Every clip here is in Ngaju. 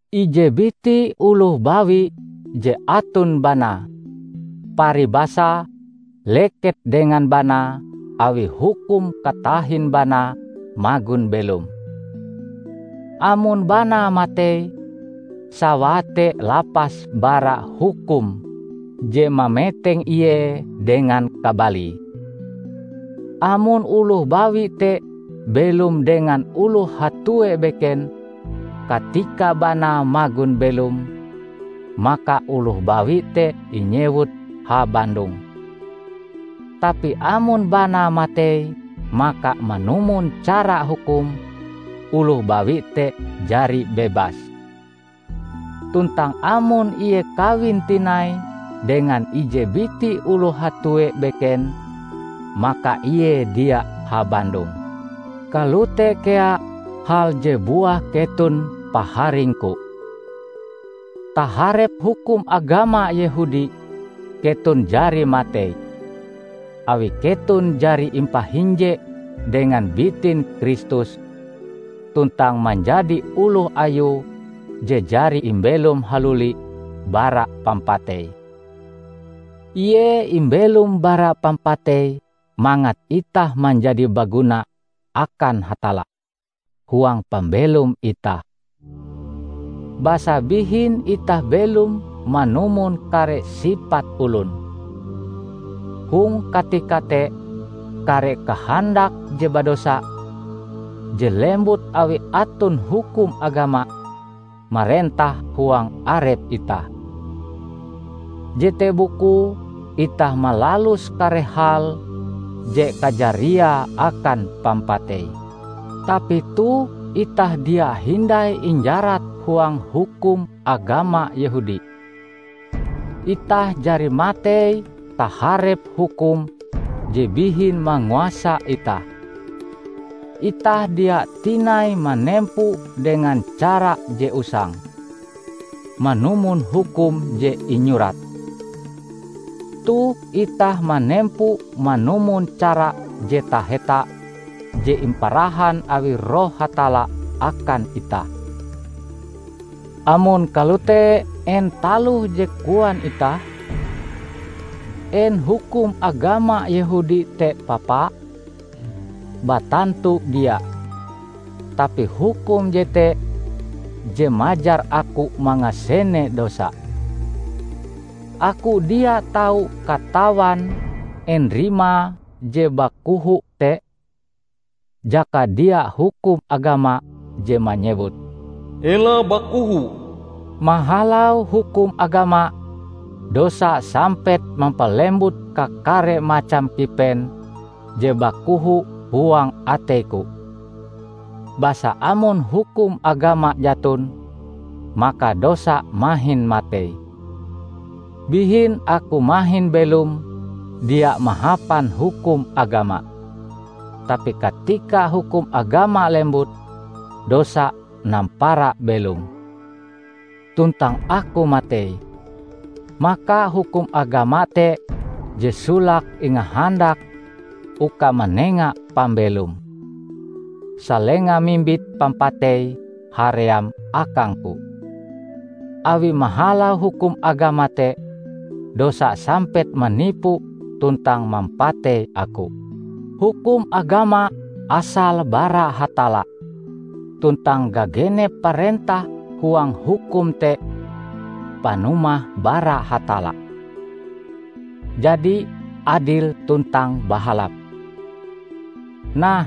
Ije biti oloh bawi je aton banae, paribasae, leket dengan banae awi hukum katahin banae magon belom. Amon banae matei, sawae te lapas bara hukum je mameteng ie dengan kabalie. Amon oloh bawi te belom dengan oloh hatue beken katika banae magon belom, maka oloh bawi te inyewut habandong. Tapi amon banae matei, maka manumon cara hukum, oloh bawi te jari bebas. Tuntang amon ie kawin tinai dengan ije biti oloh hatue beken, maka ie dia habandong. Kalote kea hal je buah keton paharingku. Taharep hukum agama Yehudi keton jari matei, awi keton jari impahinje dengan bitin Kristus tuntang manjadi oloh Ayue je jari imbelom haluli bara pampatei. Ie imbelom bara pampatei mangat itah manjadi baguna akan Hatalla huang pambelom itah. Basa bihin itah belom manumon kare sipat olon. Hong katika te kare kahandak je badosa, je lembut awi aton hukum agama, marentah huang arep itah. Jete bukue itah malalus kare hal je kajariae akan pampatei. Tapi toh itah dia hindai injarat huang hukum agama Yehudi. Itah jari matei taharep hukum je bihin manguasa itah. Itah dia tinai manempo dengan cara je usang, manumon hukum je inyurat. Toh itah manempo manumon cara je taheta je imparahan awi Roh Hatalla akan itah. Amon kalote en taloh je koan itah? En hukum agama Yehudi te papa? Batantu dia! Tapi hukum jete je majar aku mangasene dosa. Aku dia tau katawan en rimae je bakoho te, jaka dia hukum agama je manyewut "Ela bakoho." Mahalau hukum agama, dosa sampet mampalembut kakare macam kipen je bakoho huang ateiku; basa amon hukum agama jaton, maka dosa mahin matei. Bihin aku mahin belom dia mahapan hukum agama. Tapi katika hukum agama lembut, dosa nampara belom tuntang aku matei. Maka hukum agama te je solake ingahandak uka manenga pambelom, salenga mimbit pampatei haream akangku. Awi mahalau hukum agama te, dosa sampet manipu tuntang mampatei aku. Hukum agama asale bara Hatalla, tuntang gagenep parentah huang hukum te panumahe bara Hatalla, jadi adil tuntang bahalap. Nah,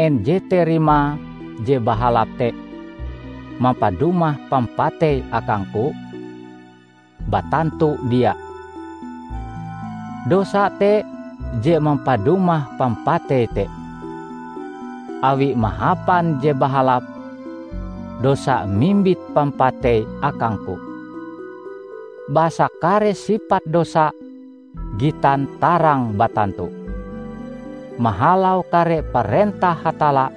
en jete rimae je bahalap te mampadumah pampatei akangku? Batantu dia! Dosa te je mampadumah pampatei te. Awi mahapan je bahalap, dosa mimbit pampatei akangku, basa kare sipat dosa gitan tarang batantu. Mahalau kare parentah Hatalla,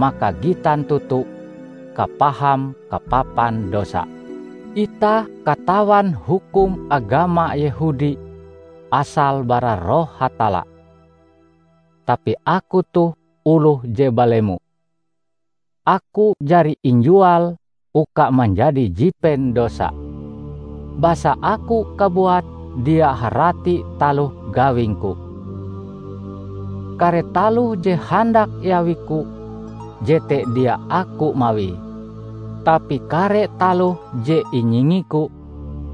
maka gitan toto kapaham kapapan dosa. Itah katawan hukum agama Yehudi asale bara Roh Hatalla; tapi aku toh oloh je balemo. Aku jari injual uka manjadi jipen dosa. Basa aku kabuat dia harati taloh gawingku. Kare taloh je handak iawiku, jete dia aku mawie; tapi kare taloh je inyingiku,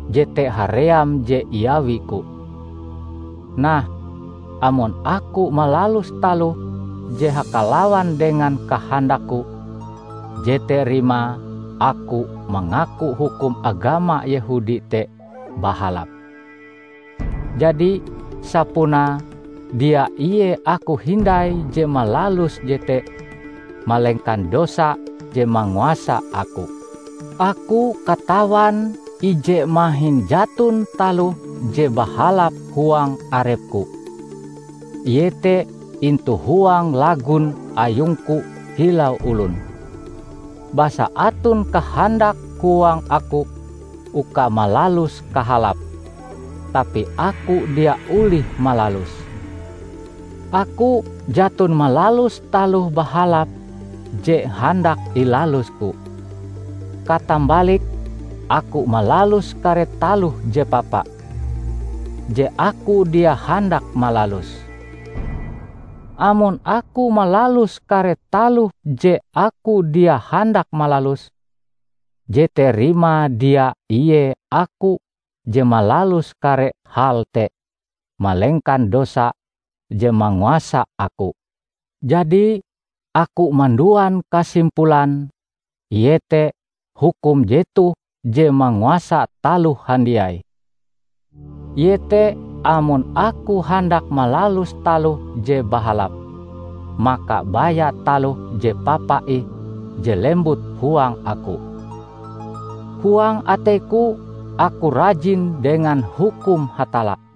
jete haream je iawiku. Nah, amon aku malalus taloh je hakalawan dengan kahandakku, jete rimae aku mangaku hukum agama Yehudi te bahalap. Jadi, sapunae dia ie aku hindai je malalus jete, malengkan dosa je manguasa aku. Aku katawan ije mahin jaton taloh je bahalap huang arepku; iete intu huang lagun ayungku kilau olon. Basa aton kahandak huang aku uka malalus kahalap, tapi aku dia olih malaluse. Aku jaton malalus taloh bahalap je handak ilalusku; katambalike aku malalus kare taloh je papa, je aku dia handak malaluse. Amon aku malalus kare taloh je aku dia handak malaluse, jete rimae dia ie aku je malalus kare hal te malengkan dosa je manguasa aku. Jadi, aku manduan kasimpulan iete hukum jetoh je manguasa taloh handiai: iete amon aku handak malalus taloh je bahalap, maka baya taloh je papa ih je lembut huang aku. Huang ateiku aku rajin dengan hukum Hatalla,